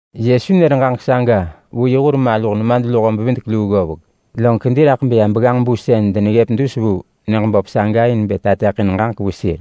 Yesu nër ġaġek saga vu yi hur maluh nemadluho-bevidek-luu ggovek, log kedi raḳ beya begganġ-bu sën deneggëp dus vu nyëġ saga in bë tateḳin ġaġek vu sir.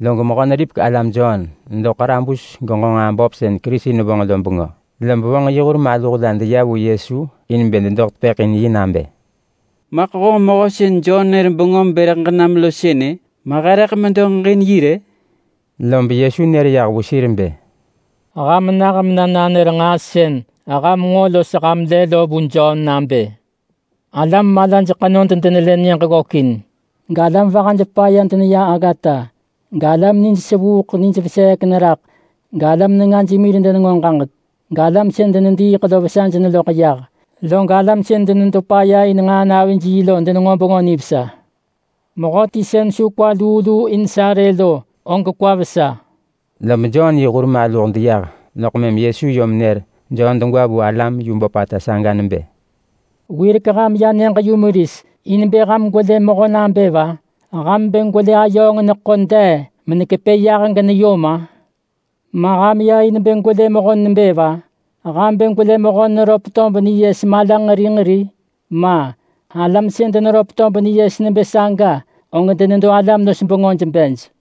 Log Mehö-neripek-alam Jon nedo ḳarabus genġo nġaa böp sën Kerisi nevonġ lo bengö, lob vonġ yi hur maluh la deya vu Yesu in bë dedoḳ tepëḳ in yi nabë, “Maḳ honġ mehö sën Jon nër bengöm bë rëḳ ġenam lo sënë, ma he rëḳ medo ġeġin yi rë?” Lob Yesu nër yah vu sir bë, “Ham nah mena nanër nġaa sën ham nġo los ham lë lo vu Jon nabë, alam malaj ḳenod denelë nyëġ ggökin, galam vahaj paya deneya aggata, galam nij sevuuḳ nij veseek neraḳ galam nengaj mir denenġo ġaġek, galam sën denediiḳ lo vesaj neloḳ yah, log alam sën denedo paya in nġaa navij yi lo denenġo Bengö Nivesa. Mehöti sën su kwa luu luu in sa rë lo, og kwa vesa!” Lob Jon yi hur maluh deyah loḳ mëm Yesu yom nër Jon degwa vu alam yu böpata saga nebë, “Wirek ham ya nyëġ-yumeris in bë ham gwelë mehö nebë va? Ham bë gwelë ayööng neḳo dee menekepë yah geneyom-a? Ma ham ya in bë gwelë mehö nebë va? Ham bë gwelë mehöti neröp tob niyes mala nġeri nġeri? Ma! Alam sën deneröp tob niyes nebë saga, og denedo alam-los-bengöj bej.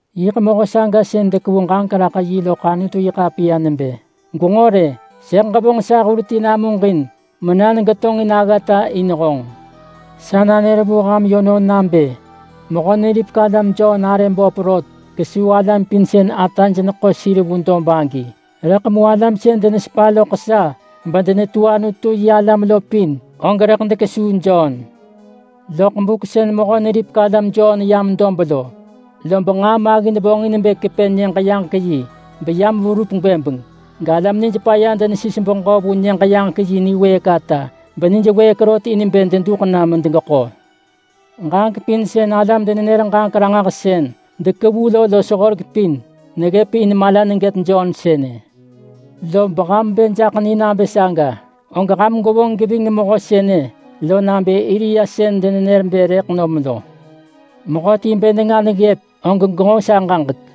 Yiḳ mehö saga sën dekevu ġaġek raḳ yi loḳ Anutu-yi-ḳapiya nebë: ‘Gwenġo rë! Sëḳ ġevonġ sa hur ti namuġin, mena negetonġin aggata in honġ!’ Sa nanër vu ham yönon nabë Mehö-neripek-alam Jon arë böp rot kesuu alam pin sën ataj neḳo sir vu dob agi. Rëḳ mu alam sën denesepa loḳ sa bedenetu Anutu-yi-alam lo pin, og rëḳ dekesuu Jon. Loḳ buk sën Mehö-neripek-alam Jon yam dob lo, lob nġaa maggin vonġin bë kepë Nyëġ-yaġek-yi beyam verup gwëbeng, galam nijpaya denesis beġö vu Nyëġ-yaġek-yi niwëëk ata benij wëëk rot in bë deduḳ na medegeḳo. Ġaġek pin sën alam-denenër-ġaġek-ranġahsën dekevu lo los horek pin, neggëp in mala negët Jon sënë. Lob ham bë jaḳ ni nabë saga, og ham gwevonġ geving mehö sënë lo nabë Elia sën denenër bë rëḳ nom lo. Mehöti bë nenga neggëp, og genġo sa ġaġek.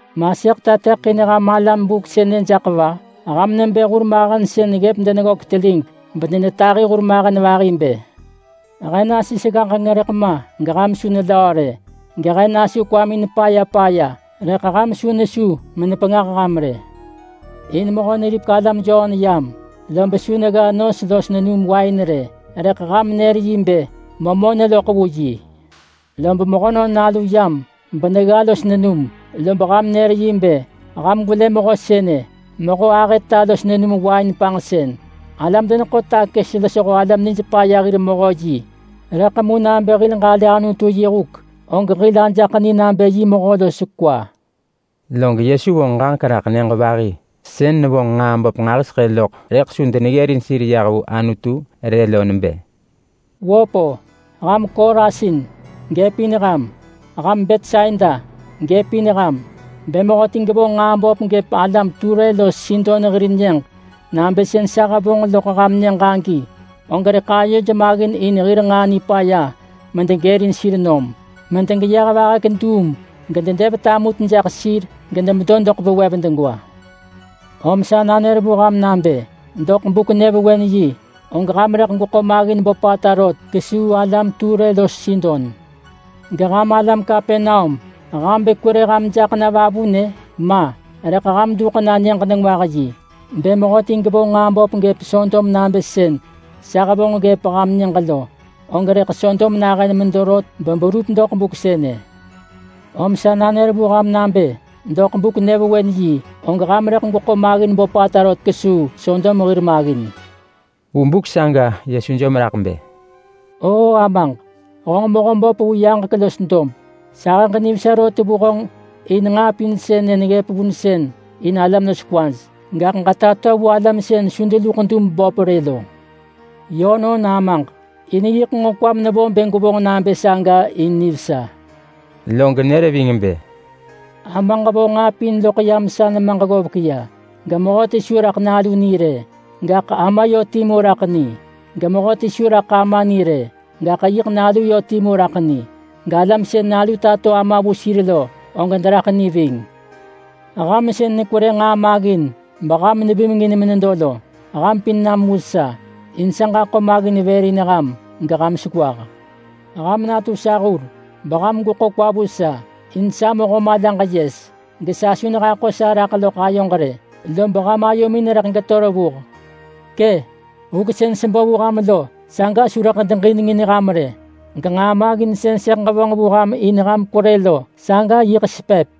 Ma sëḳ tateḳin ham alam buk sënë jaḳ va? Ham nebë hurmahen sën ggëp deneggök telig bedenetahi hurmahen vahi bë: ‘He nasis ggaġeng rëḳ ma geham su nelöö rë. Gehe nasu kwamin paya paya, rëḳ ham su nesu menepengah ham rë.’ In Mehö-neripek-alam Jon yam, lob su negga nos los nenum wain rë, rëḳ ham nër yi nebë, ‘Memö neloḳ vu yi!’ Lob Mehönon Nalu yam benegga los nenum, lob ham nër yi bë, ‘Ham gwelë mehö sënë! Mehö ahëta los nenum wain panġsën, alam-deneḳo-takës losho alam nijpaya hir mehö yi!’ Rëḳ mu nabë hil ġalë Anutu yi huk og hil ajaḳ ni nabë yi mehö los kwa.” Log Yesu vonġ ġaġek raḳ nyëġ vahi sën nevonġ nġaa böp nġahiseḳë loḳ rëḳ su deneggërin sir yah vu Anutu rë lo nebë, “Wöp-o! Ham Korasin! Gëp in ham! Ham Betsaida! Gëp in ham! Bë mehöti gevonġ nġaa böp gëp alam Ture los Sidon hir nyëġ nabë sën sa hevonġ loḳ ham nyëġ agi, og rëḳ ayoj maggin in devonġ nġaa nipaya medegërin sir nom, medegeyeh vahek duum gededev tamut jak sir gedemedo doḳ vewev degwa. Om sa nanër vu ham nabë, doḳ Buk-nyëvewen-yi, og ham rëḳ gweḳo maggin böpata rot kesuu alam Ture los Sidon. Geham alam Kapernaum, ham bë kwerë ham jaḳ na vavunë? Ma! Rëḳ ham duḳ na Nyëġ-nengwah-yi. Bë mehöti gevonġ nġaa böp gëp Sodom nabë sën sa hevonġ ggëp ham nyëġ lo, og rëḳ Sodom nahën medo rot beberup doḳ buk sënë. Om sa nanër vu ham nabë doḳ Buk-nyëvewen-yi, og ham rëḳ gweḳo maggin böpata rot kesuu Sodom hir maggin!” Vu buk saga Yesu jom raḳ bë, “O Amaġ! Honġ Mehöböp vu yaġek los dob. Sahëġ nivesa rot vu honġ in nġaa pin sënë neggëp vunsën in alam los kwaj, gaḳ ġetato vu alam sën su deluḳ dub böp rë lo. Yönon Amaġ! In yiḳ nġo kwam nevo bë gwevonġ nabë saga in nivesa.” Log nër ving bë, “Amaġ vo nġaa pin loḳ yam sa nemaġ ggovek ya. Gemehöti su raḳ Nalu ni rë, gaḳ Ama yö timu raḳ ni. Gemehöti su raḳ Ama ni rë, gaḳ yiḳ Nalu yö timu raḳ ni. Galam sën Nalu tato Ama vu sir lo, og deraḳ ni ving. Ham sën nekwerë nġaa maggin, beham nevimengin menedo lo, ham pin nam vu sa, in sa ġaḳo maggin vër in ham geham sewah. Ham natu sa hur, beham gweḳo kwa vu sa. In sa mehö malaġ yes, gesa su nehaḳo sa raḳ loḳ ayoġ rë, lob ham ayomin rëḳ geto megëp revuh. Kë! Huk sën sebo vu ham lo saga su rëḳ deġinengin ham rë, genġaa maggin sën sëḳ ġevonġ vu ham in ham kwerë lo, saga yiḳ sepëp!”